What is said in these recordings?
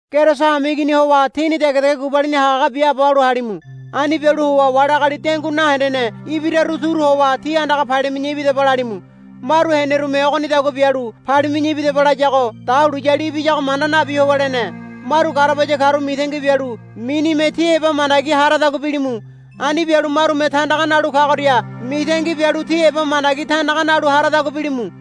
Keriso hameigini howa tíni degedege gubalini hagahaga biaabo halu halimu. Ani bialu howa wali agali dengui nahendene ibiraru turu howa tí andaga palimi̱ya ibidaba lalimu. Maru henerume ogonidagua bialu, Palimi̱ya ibidaba, layago dahuliyali ibiyago manda nabi howa lene. Maru garabaya karu mitangi bialu minime ti heba mandagi haradagua bilimu. Ani bialu marume tandaga nalu kagoria mitangi bialu ti heba mandagi tandaga nalu haradagua bilimu.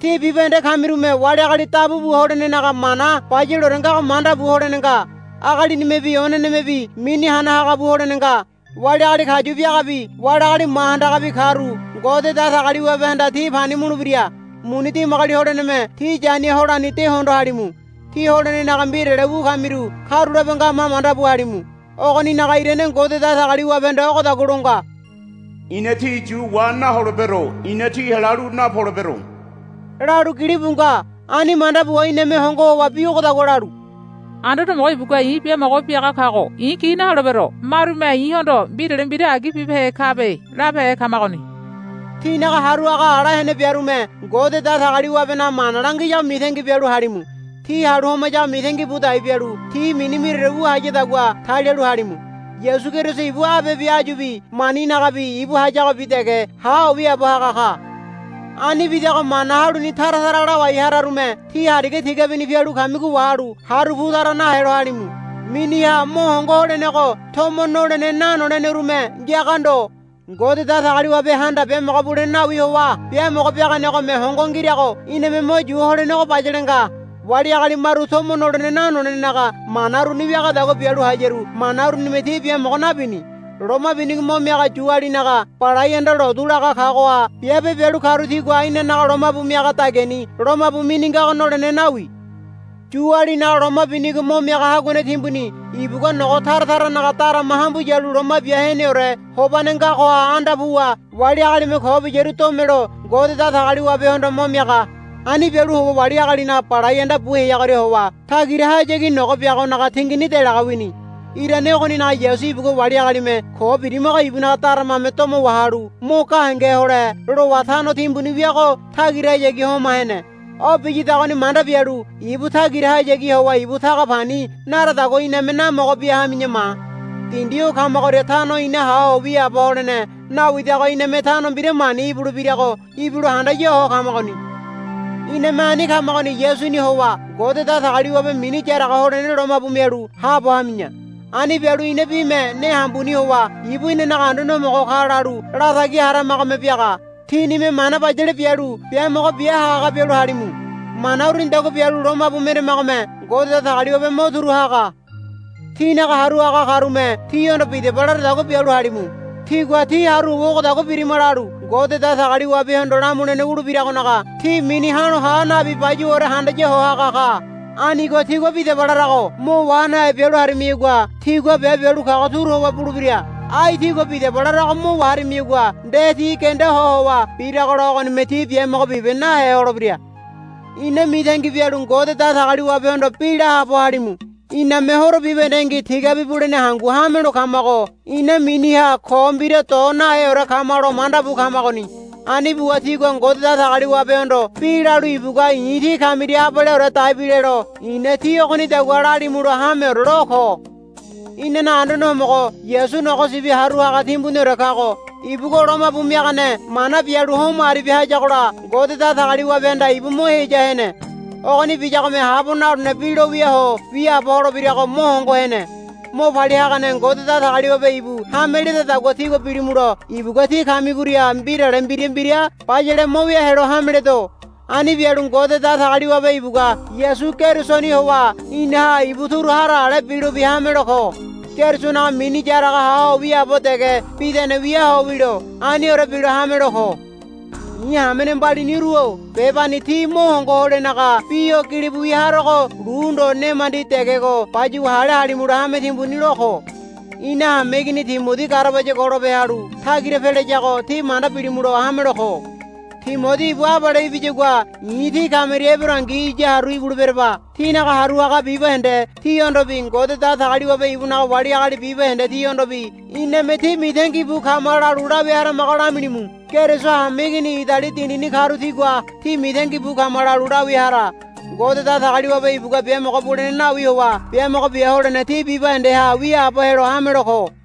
Tí bibahende kamirume wali agali dabu bu holenenaga mana bayaleore ngago manda bu holene nga. Agalinimebi onenemebi mini hana haga bu holene nga. Wali agali kayu biagabi wali agali ma handagabi karu Ngode Datagaliwabehanda ti pani mulebira. Muni dimagoli holeneme tí yania holani de hondo halimu. Tí holenenaga mbirale wu kamiru karulape ngama manda bu halimu. Ogoninaga irane Ngode Datagaliwabehanda ogodagua lo nga, I̱na tí yu wa naholebero. I̱na tí helalu napolebero, lalu gilibu nga. Ani manda buwa iname hongo howa bi ogodagua lalu, Anduane Homogo ibugua i̱ biamogo biaga kago i̱ gi naholebero. Marume i̱hondo mbirale mbira agi bibehe kabe, labehe kamagoni. Tínaga haru haga ala hene biarume Ngode Datagaliwabenaga mana langiyago mitangi bialu halimu. Ti halu homayago mitangi bu dai bialu ti mini mbiraore wu hayadagua talialu halimu. Yasu Keriso ibu abebi áyubi maninagabi ibu hayagobi dege ha ho wiaabo haga ka. Ani bidago mana haluni tara tara lawai hararume ti hariga tigabini pialu kamigo wahalu haru pu tara nahelo halimu. Miniha mo hongo holenego tomo nolene nanolenerume ngiaga ndo. Ngode Datagaliwabehanda biamogo bulene nawi howa biamogo biaganegome hongo ngirago iname mo yu holenego bayale nga. Wali agali maru tomo nolene nanolenenaga mana uruni wiadagua bialu hayaru mana urunime ti biamogo nabini. Loma binigo mo miaga Yualinaga balai anda lotu laga kagoha biabe bialu karu tigua inanaga lomabu miaga dagiani lomabu mini ngago nolene nawi. Yualinaga loma binigo mo miaga haguane timbuni ibugua nogo tara taranaga darama hambu yalu Loma Bia Heneore Hobane ngagoha anda puwa wali agalime ko biyaru domelo Ngode Datagaliwabehondo mo miaga. Ani bialu howa wali agalinaga balai anda bu heagoria howa tagirahayagi nogo biagonaga tingini delaga wini. Irane ogoninaga Yasu ibugua wali agalime ko birimago ibunaga daramame domo wahalu mo gahenge hole lowa tano timbuni wiago tagirahayagi homa hene. O biyadagoni manda bialu ibu tagirahayagi howa ibu taga pani naradagua iname namogo bia hami̱ya ma. Dindi o kamagoria tano ina ha ho wiaabo holene nawidago iname tano mbira mani ibulebirago ibilo handaya ho kamagoni. Iname ani kamagoni Yasuni howa Ngode Datagaliwabe mini yaraga holene lomabu mialu haabo hami̱ya. Ani bialu ina bime ne hambuni howa, Ibu inanaga Anduane Homogo ka, lalu latagi haramagome biaga. Tínime mana bayale bialu biamogo bia hagahaga bialu halimu. Mana urunidagua bialu lomabu meramagome Ngode Datagaliwabe mo turu haga. Tínaga haru haga karume tíhondo, Bidaba, laradagua bialu halimu. Tigua tí haru howa, Ogodagua birima, lalu Ngode Datagaliwabehondo lamulene wulebiragonaga ti mini ha̱lo ha nabi bayuwaore handaya ho haga ka. Anigo tigua, Bidaba, larago mo wa nahe bialu harimiyagua tigua biabe bialu kago turu howa bulebira. Ai tigua, Bidaba, larago mo waharimiyagua nde ti genda ho howa biragola ogonime tí biamogo bibe nahe holebira. Ina mitangi bialu Ngode Datagaliwabehondo bi la haabo halimu. Iname horo bibahendengi tigabi bulene hangu hamelo kamago ina miniha ko mbira do naheore kamalo manda bu kamagoni. Ani buwa tígua Ngode Datagaliwabehondo bi lalu ibugua i̱ tí kamiria abaleore daibilelo i̱na tí ogonidagua lalimulo hameore lo ko. Inanaga Anduane Homogo Yasu Nogo Sibi Haru Haga Timbuniore kago ibugua lomabu miagane mana bialu homo aribia hayagola Ngode Datagaliwabehanda ibu mo heya hene. Ogoni biyagome habo nalolene bi lo wia ho wiaabo holebirago mo hongo hene. Mo palia hagane Ngode Datagaliwabe ibu hame ledadagua tígua bilimulo ibugua tí kamigoria mbirale mbira mbira bayale mo wia helo hameledo. Ani bialu Ngode Datagaliwabe ibugua Yasu Kerisoni howa inaha ibu turu hara ale bilobi hamelo ko. Kerisonaga mini yaraga ha ho wia dege bidane wia ho wilo. Aniore bilo hamelo ko. I̱ hamene mbaliniru-o bebani tí mo hongo holenaga bi o gilibu wia harogo lu ndo nemandi degego bayuwa hale halimulo hame timbuni lo ko. Ina hameigini Timodi garabaya golope halu tagira pelayago tí manda bilimulo hamelo ko. Timodi ibu abale ibiyagua i̱ tí kamiria eberongi iya haru ibuleberaba. Tínaga haru haga bibahende tihondobi Ngode Datagaliwabe ibunaga wali agali bibahende tihondobi, Iname tí mitangi bu kama, lalu lawia haramago lamilimu. Keriso hameigini Idali dindini karu tigua, Tí mitangi bu kama lalu, lawia hara. Ngode Datagaliwabe ibugua biamogo bulene nawi howa biamogo bia holene tí bibahendeha wiaabo helo hamelo ko.